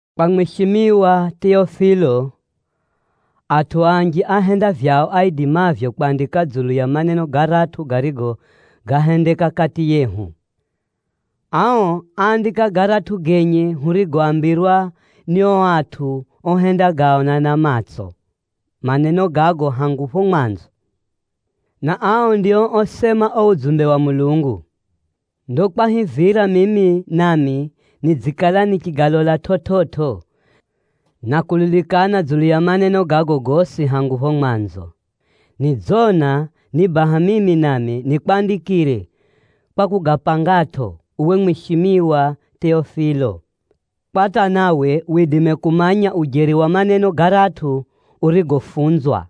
Kwa mwishimiwa Teofilo, Atʼu anji áhenda vyao aidimavyo kwandika dzulu ya maneno garatʼu garigo gáhendeka kati yehu. Ao áandika garatʼu genye hurigoambirwa ni ao atʼu ohendagaona na matso maneno gago hangu phapho mwanzo, na ao ndio osema uo udzumbe wa Mulungu. Ndo kwahivira mimi nami nidzikala nichigalola chividzo, na kulilikana dzulu ya maneno gago gosi hangu phapho mwanzo, nidzona ni baha mimi nami nikwandikire kwa kugapangatʼo, uwe mwishimiwa Teofilo, kwa hata nawe widime kumanya ujeri wa maneno garatʼu urigofunzwa.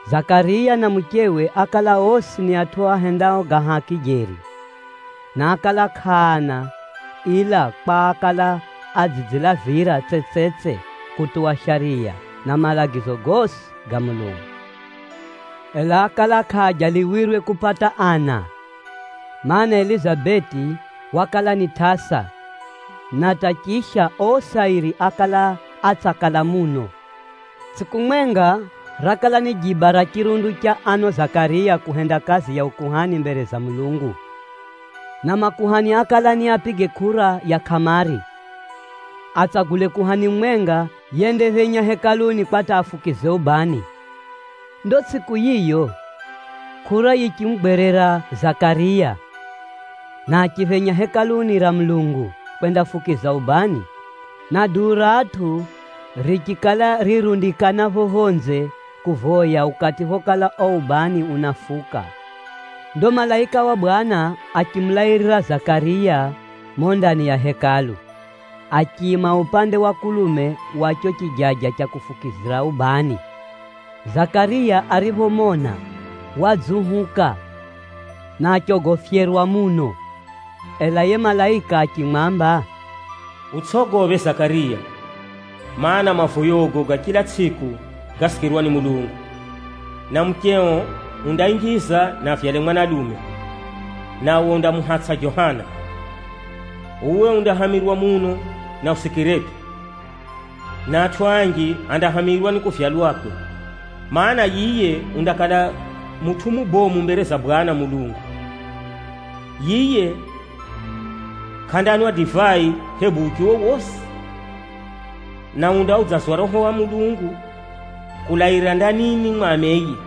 Zakariya na muchewe ákala osi ni atʼu ahendao ga haki jeri, na ákala kʼaana ila kwa ákala adzidzilavira tsetsetse kutuwa shariya, na malagizo gosi ga Mulungu. Ela ákala kʼaajaliwirwe kupata ana, mana, Elizabeti wakala ni tʼasa, na hata chisha osi airi ákala atsakala muno. Tsʼiku mwenga, rakala ni jiba ra chirundu cha ano Zakariya kuhenda kazi ya ukuhani mbere za Mulungu. Na makuhani ákala niapige kʼura ya kʼamari, atsagule kuhani mumwenga yendaphenya Hekaluni kwa hata afukize ubani. Ndo tsʼiku yiyo, kʼura yichimugwerera Zakariya, na achiphenya Hekaluni ra Mulungu kwendafukiza ubani, na duu ra atʼu richikala rirundikana pho phonze kuvoya ukati phokala uo ubani unafuka. Ndo malaika wa Bwana achimulairira Zakariya mumo ndani ya Hekalu, achiima upande wa kulume wa cho chijaja cha kufukizira ubani. Zakariya ariphomona, wadziuhuka, na achogofyerwa muno. Ela yiye malaika achimwamba, “Utsʼogophe Zakariya, mana, mavoyogo ga chila tsʼiku gasikirwa ni Mulungu, na mucheo undainjiza na avyale mwanalume, nawe undamuhatsʼa Johana. Uwe undahamirwa muno na usikiretʼo, na atʼu anji andahamirwa ni kuvyalwakwe, mana, yiye undakala mutʼu mubomu mbere za Bwana Mulungu. Yiye kʼandanwa divai hebu uchi wowosi, na undaudzazwa Roho wa Mulungu kulaira ndanini mwa ameye.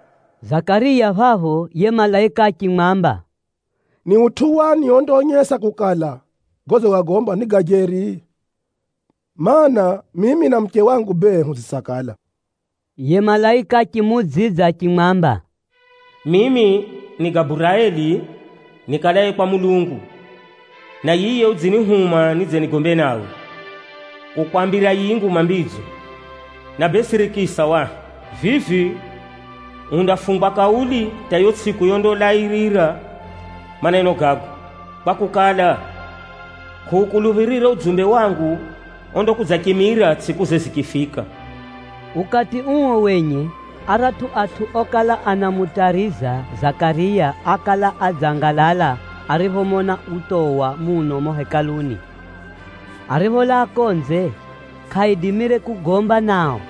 Zakariya phapho yiye malaika achimwamba, “Ni utʼu wani ondaonyesa kukala, godzigagomba ni ga jeri? Maana, mimi na muche wangu bee, hudzitsakala.” Yiye malaika achimuudzidza achimwamba, “Mimi ni Gaburaeli nikalaye kwa Mulungu, na yiye udzinihuma nidze nigombe nawe, kukwambira yiyi nguma mbidzo. Na bee sirikisa wahi, vivi undafungwa kauli hata yiyo tsʼiku yondalairira maneno gago, kwakukala, kʼuukuluphirire udzumbe wangu ondakudzachimira tsʼikuze zichifika.” Ukati uo wenye aratʼu atʼu okala anamutariza Zakariya ákala adzangalala ariphomona utowa muno mumo Hekaluni. Aripholaa konze, kʼaidimire kugomba nao.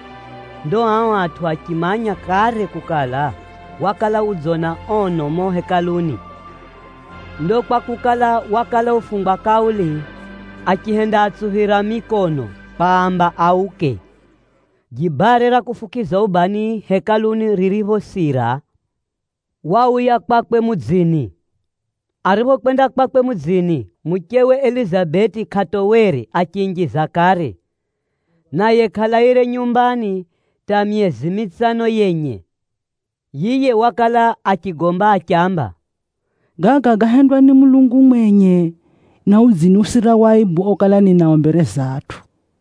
Ndo ao atʼu achimanya kare kukala, wakala udzona ono mumo Hekaluni. Ndo kwakukala, wakala ufungwa kauli, achihendaatsuphira mikono kwaamba auke. Jibare ra kufukiza ubani Hekaluni ririphosira, wauya kwakwe mudzini. Ariphokwenda kwakwe mudzini, muchewe Elizabeti kʼatowere achiinjiza kare, naye kʼalaire nyumbani hata myezi mitsano yenye. Yiye wakala achigomba achiamba, “Gaga gáhendwa ni Mulungu mwenye, na udziniusira waibu okala ninao mbere za atʼu.”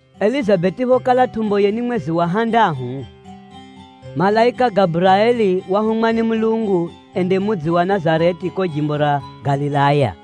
Elizabeti phokala tʼumboye ni mwezi wa handahu, malaika Gaburaeli wahumwa ni Mulungu ende mudzi wa Nazareti kuko jimbo ra Galilaya,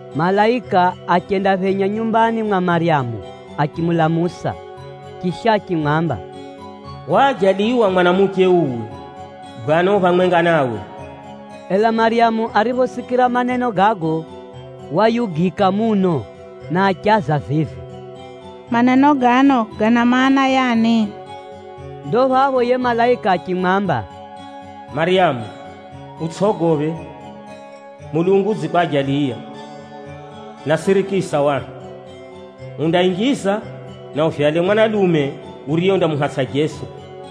Malaika achendaphenya nyumbani mwa Maryamu achimulamusa. Chisha achimwamba, “Waajaliwa mwanamuche uwe, Bwana u phamwenga nawe!” Ela Maryamu ariphosikira maneno gago wayugika muno na achaza vivi, “Maneno gano gana maana, yani?” Ndo phapho yiye malaika achimwamba, “Maryamu, utsʼogophe, Mulungu udzikwajaliya. Na sirikisa wahi: undainjiza, na uvyale mwanalume uriye undamuhatsʼa Jeso.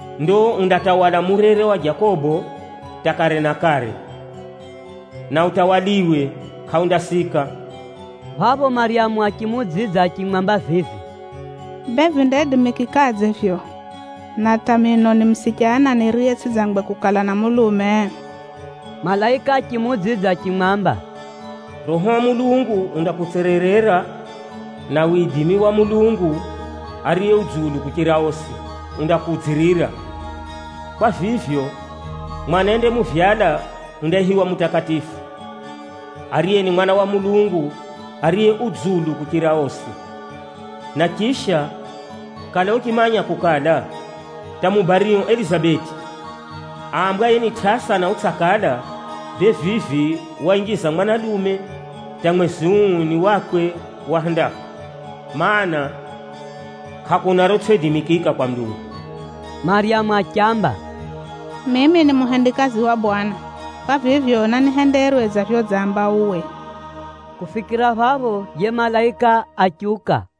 Ndo undatawala murere wa Jakobo hata kare na kare, na utawaliwe kʼaundasika.” Phapho Maryamu achimuudzidza achimwamba vivi, “Bee vindaidimikikadze vivyo, na hata mino ni musichana niriye tsʼidzangwe kukala na mulume?” Malaika achimuudzidza achimwamba, “Roho wa Mulungu undakutsererera, na widimi wa Mulungu Ariye Dzulu kuchira osi undakukudzirira. Kwa vivyo, mwana yendamuvyala undaihiwa mutakatifu, ariye ni Mwana wa Mulungu ariye u dzulu kuchira osi. Na chisha, kala uchimanya kukala, hata mubario Elizabeti aambwaye ni tʼasa na utsakala, bee vivi wainjiza mwanalume hata mwezi uu ni wakwe wa handahu. Maana, kʼakuna rotsʼiidimikika kwa Mulungu.” Maryamu achiamba, “Mimi ni muhendikazi wa Bwana, kwa vivyo nanihenderwe dza vyodzamba uwe.” Kufikira phapho, yiye malaika achiuka.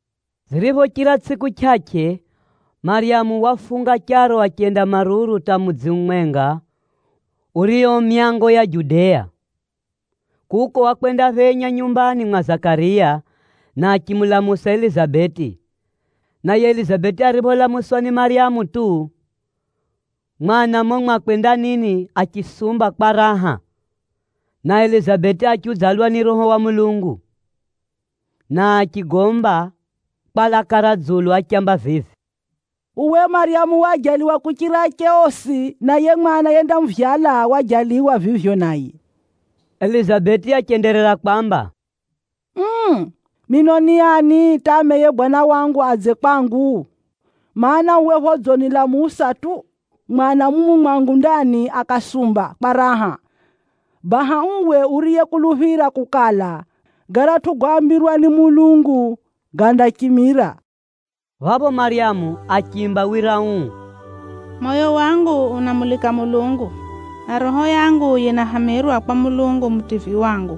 Ziriphochira tsʼiku chʼachʼe, Maryamu wafunga charo achenda maruru hata mudzi umwenga urio myango ya Juda. Kuko wakwendaphenya nyumbani mwa Zakariya, na achimulamusa Elizabeti. Naye Elizabeti aripholamuswa ni Maryamu tu, mwana mumo mwakwe ndanini achisumba kwa raha, na Elizabeti achiudzalwa ni Roho wa Mulungu, na achigomba kwa laka ra dzulu achiamba vivi, “Uwe Maryamu waajaliwa kuchira ache osi, na yiye mwana yendamuvyala waajaliwa vivyo naye!” Elizabeti achenderera kwamba, “Uu! Mino ni ani hata ameye Bwana wangu adze kwangu! Maana, uwe phodzinilamusa tu, mwana mumu mwangu ndani akasumba kwa raha. Baha uwe uriyekuluphira kukala, garatʼu goambirwa ni Mulungu gandachimira.” Phapho Maryamu achiimba wira uu, “Moyo wangu unamulika Mulungu, na roho yangu yinahamirwa kwa Mulungu Mutivyi wangu.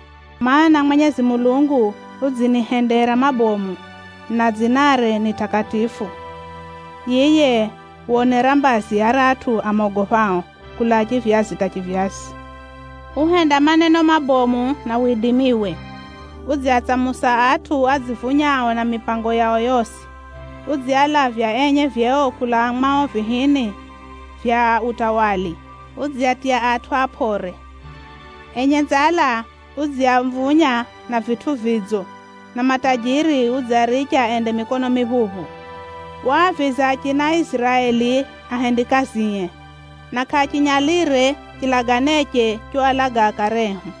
mana, Mwenyezi Mulungu udzinihendera mabomu, na dzinare ni takatifu. Yiye wonera mbazi aratʼu amogophao, kulaa chivyazi hata chivyazi. Uhenda maneno mabomu na widimiwe: udziatsamusa atʼu adzivunyao na mipango yao yosi: udzialavya enye vyeo kulaa mwao vihini vya utawala, udziatiya atʼu apʼore. Enye nzala udziamvunya na vitʼu vidzo, na matajiri udziaricha ende mikono miphuphu. Waaviza achina Iziraeli ahendikazie, na kʼachinyalire chilaganeche choalaga akare ehu.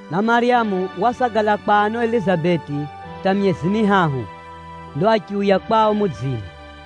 Na Maryamu wasagala kwa ano Elizabeti hata myezi mihahu, ndo achiuya kwao mudzini.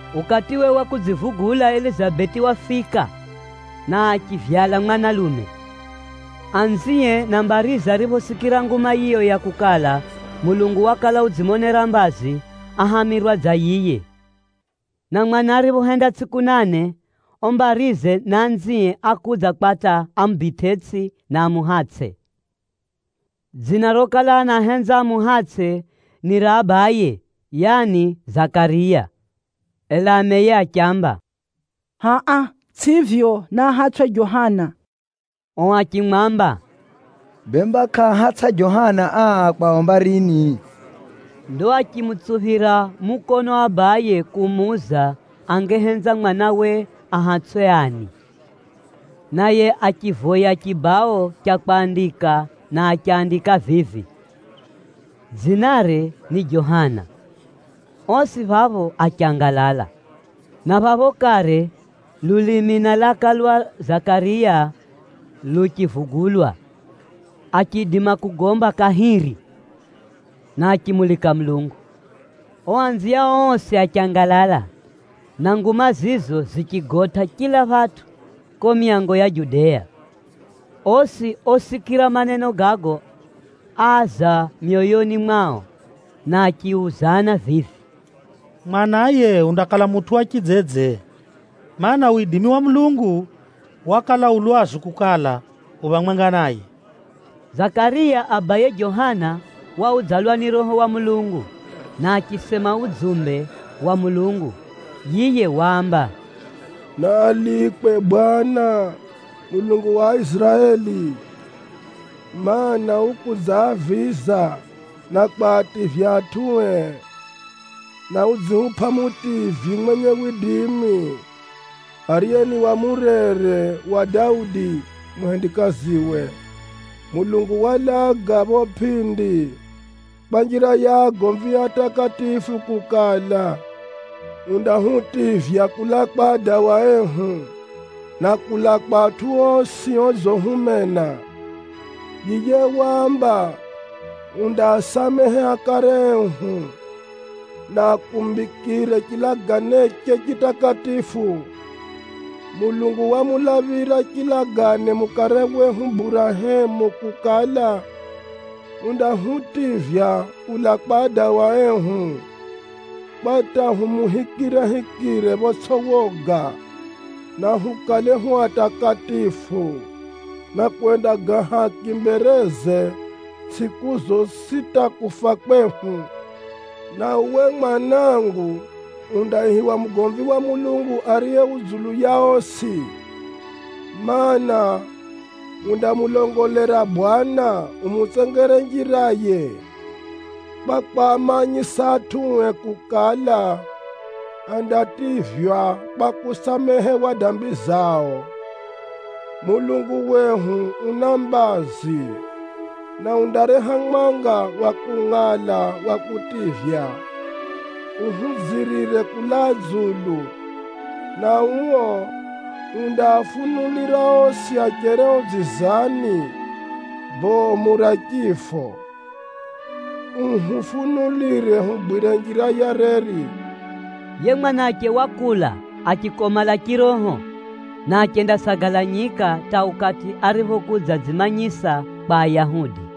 Ukatiwe wa kudzivugula Elizabeti wafika, na achivyala mwanalume. Anzie na mbarize ariphosikira nguma yiyo ya kukala, Mulungu wakala udzimonera mbazi, áhamirwa dza yiye. Na mwana ariphohenda tsʼiku nane, ao mbarize na anzie ákudza kwa hata amubitʼetsʼi, na amuhatsʼe. Dzina rokala anahenza amuhatsʼe ni ra abaye, yani Zakariya. Ela ameye achiamba, “Hʼa-a, tsʼivyo, naahatsʼwe Johana.” Ao achimwamba, “Bemba kʼaahatsʼa Johana aa kwao mbarini?” Ndo achimutsuphira mukono abaye kumuuza angehenza mwanawe ahatsʼwe ani. Naye achivoya chibao cha kwandika na achandika vivi, “Dzinare ni Johana.” Osi phapho achangalala. Na phapho kare lulimi na laka lwa Zakariya luchivugulwa, achiidima kugomba kahiri, na achimulika Mulungu. Ao anziao osi achangalala, na nguma zizo zichigotʼa chila phatʼu kuko myango ya Judea. Osi osikira maneno gago áaza myoyoni mwao, na achiuzana vivi, “Mwana yiye undakala mutʼu wa chidzedze? Maana, widimi wa Mulungu wakala u lwazu kukala, u phamwenga naye.” Zakariya abaye Johana waudzalwa ni Roho wa Mulungu, na achisema udzumbe wa Mulungu. Yiye waamba, “Naalikwe Bwana Mulungu wa Aiziraeli, mana, ukudzaaviza, na kwativya atʼue, na udzihupʼa Mutivyi mwenye widimi, ariye ni wa murere wa Daudi, muhendikaziwe. Mulungu walaga phapho pʼindi kwa njira ya agomvie atakatifu kukala, undahutivya kulaa kwa adawa ehu, na kulaa kwa atʼu osi odzihumena. Yiye waamba undaasamehe akare ehu, na akumbikire chilaganeche chitakatifu. Mulungu wamulaphira chilagane mukare wehu Burahemu kukala, undahutivya kulaa kwa adawa ehu kwa hata humuhikirehikire photsʼi woga, na hukale hu atakatifu, na kuhenda ga haki mbereze tsʼiku zosi hata kufa kwehu. Na uwe mwanangu undaihiwa mugomvi wa Mulungu Ariye Dzulu kuchira osi, mana, undamulongolera Bwana umutsengere njiraye, kwa kwamanyisa atʼue kukala, andativywa kwa kusamehewa dambi zao. Mulungu wehu una mbazi, na undareha mwanga wa kungʼala wa kutivya, uhudzirire kulaa dzulu, na uo undaafunulira osi acherio dzizani bomu ra chifo, uhufunulire hugwire njira ya reri.” Yiye mwanache wakula achikomala chiroho, na achendasagala nyika hata ukati ariphokudzadzimanyisa kwa Ayahudi.